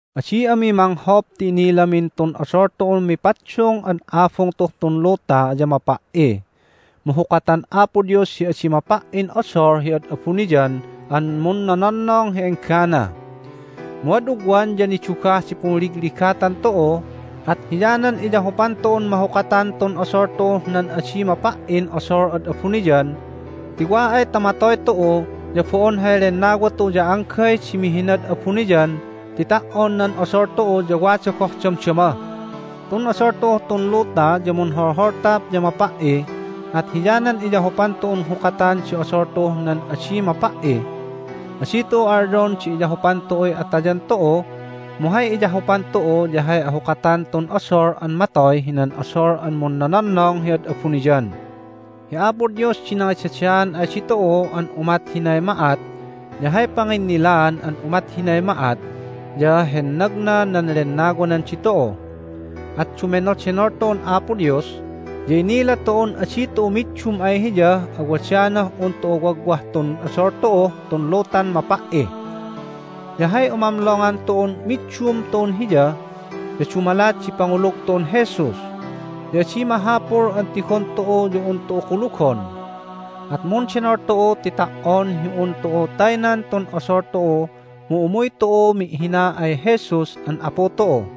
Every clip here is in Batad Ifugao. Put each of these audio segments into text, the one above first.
Adi ami manghop ti inilamin tun odol tu'un mipaddung an abung tu'uh tun luta ya mapa"i, mu hukatan Apo Dios hi adi mapa"in odol hi ad abuniyan an munnononnong hi enggana. Mu ad ugwan ya nidugah di punligligatan tu'u, at hiyanan iyahupan tu'un mahukatan tun odol tu'uh nan adi mapa"in odol ad abuniyan, ti wa ay ta matoy tu'u ya bo'on hay lennawa tu'u ya anggay di mihinad abuniyan ti ta"on nan odol tu'u ya wada goh damdama. Tun odol tu'uh tun luta ya munholholtap ya mapa"i, at hiyanan iyahupan tu'un hukatan di odol tu'uh nan adi mapa"i. Adi tu'u alyon di iyahupan tu'uy atayan tu'u, mu hay iyahupan tu'u ya hay ahukatan tun odol an matoy hinan odol an munnononnong hi ad abuniyan. Hi Apo Dios di nangidadaan ay ditu'u an umat hinay ma'at, ya hay panginnilaan an umat hinay ma'at ya hennagna nan Lennawanan ditu'u. At dumenodenol tu'un Apo Dios, ya inila tu'un adi tu'u middum ay Hiyah awadanah un tu'u wagwah tun odol tu'uh tun lutan mapa"i. Ya hay umamlongan tu'un middum tu'un Hiya ya dumalat di pangulug tu'un Jesus. Ya adi mahapul an tigon tu'u ya un tu'u kulugon. At mundenol tu'u ti ta"on hi un tu'u taynan tun odol tu'u mu umuy tu'u mi'hina ay Jesus an Apu tu'u.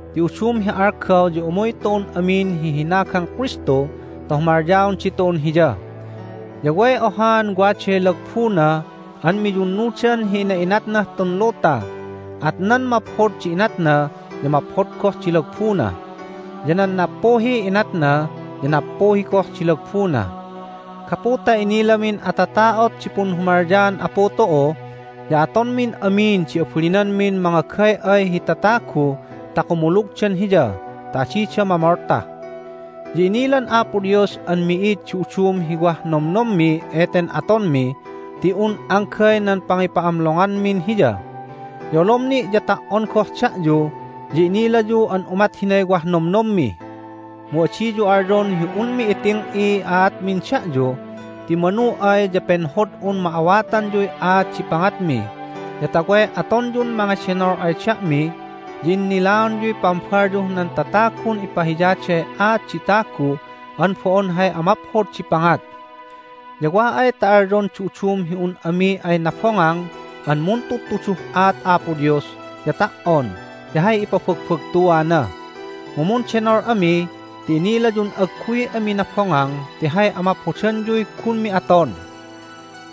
Ti udum hi algaw ya umuy tu'un amin hi hinagang Kristu ta humalyaon ditu'un Hiya. Ya way ohaan waday lagbuna an miyunnudan hi ina'inatnah tun luta. At nan maphod di inatna ya maphod goh din lagbuna, ya nan nappuhiy inatna ya nappuhi goh di lagbuna. Gapu ta inilamin atata'ot di punhumalyaan Apu tu'u ya atonmin amin di abalinanmin mangagay'ay hi tatagu ta kumulugdan Hiya ta adida mamolta. Ya inilan Apo Dios an mi'id di udum hi wah nomnommi eten atonmi ti un anggay nan pangipa'amlonganmin Hiya. Ya olom ni' ya ta"on goh da'yu ya inilayu an umat hinay wah nomnommi. Mu adiyu alyon hi unmi iting'iy aatmin da'yu, ti manu ay ya penhod'un ma'awatanyuy aat di pangatmi, ya ta way atonyun mangedenol ay da'mi, ya innilaonyuy pambalyuh nan tatagun ipahiyaday aat di tagu an bo'on hay amaphod di pangat. Ya wa ay ta alyon di udum hi un ami ay nabongang an muntudtuduh aat Apo Dios ya ta"on ti hay ipabagbagtuana. Mu mundenol ami ti inilayun agguy ami nabongang ti hay amaphodanyuy gunmi aton.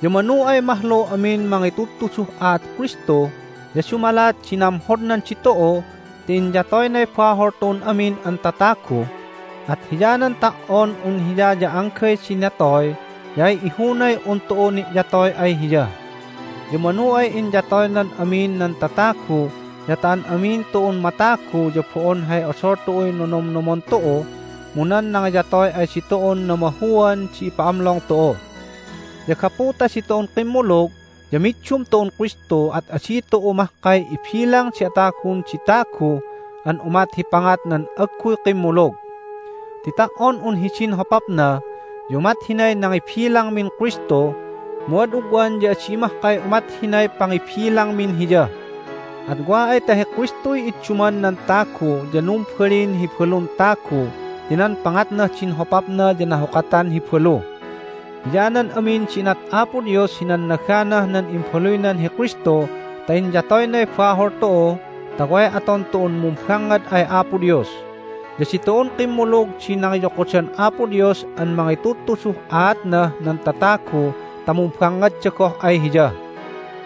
Ya manu ay mahlu amin mangitudtuduh aat Kristu ya dumalat di namhodnan ditu'u ti inyatoynay bahol tu'un amin an tatagu, at hiyanan ta"on un Hiya ya anggay di natoy ya ay ihunay un tu'u ni'yatoy ay Hiya. Ya manu ay inyatoynan amin nan tatagu ya ta an amin tu'un matagu ya bo'on hay odol tu'uy nonomnomon tu'u, mu nan nangiyatoy ay ditu'un namahuan di ipa'amlong tu'u. Ya gapu ta ditu'un kimmulug ya middum tu'un Kristu at adi tu'u mahkay ibilang di atagun di tagu an umat hi pangat nan agguy kimmulug. Ti ta"on un hidin hopapna ya umat hinay nangibilangmin Kristu, mu ad ugwan ya adi mahkay umat hinay pangibilangmin Hiya. At wa ay ta hi Kristuy idduman nan tagu ya numbalin hi balun tagu ti nan pangatnah din hopapna ya nahukatan hi balu. Hiyanan amin di inat Apo Dios hi nannaganah nan imbaluynan hi Kristu ta inyatoynay bahol tu'u ta way aton tu'un mumbangngad ay Apo Dios. Ya ditu'un kimmulug di nangiyokodan Apo Dios an mangitudtuduh aatnah nan tatagu ta mumbangngadda goh ay Hiya.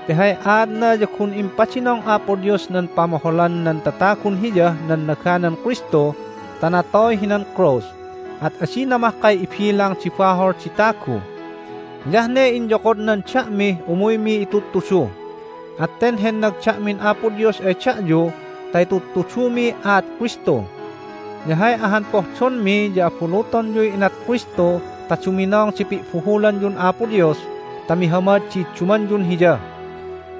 Ti hay aatna ya gun impadinong Apo Dios nan pamoholan nan tatagun Hiyah nannaganan Kristu ta natoy hinan krus, at adina mahkay ibilang di bahol di tagu. Hiyah ne inyokodnan da'mih umuymi itudtudu. At ten hennag da'min Apo Dios ay da'yu ta itudtudumiy aat Kristu. Ya hay ahan pohdonmi ya abulutonyuy inat Kristu ta duminong di pi'buhulanyun Apo Dios ta mihamad di iddumanyun Hiya.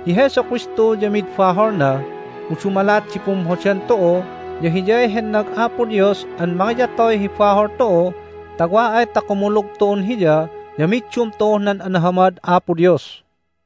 Hi Jesu Kristu ya mid baholna, mu dumalat di pumhodan tu'u ya Hiyay hennag Apo Dios an mangiyatoy hi bahol tu'u ta wa ay ta kumulug tu'un Hiya ya middum tu'uh nan anahamad Apo Dios.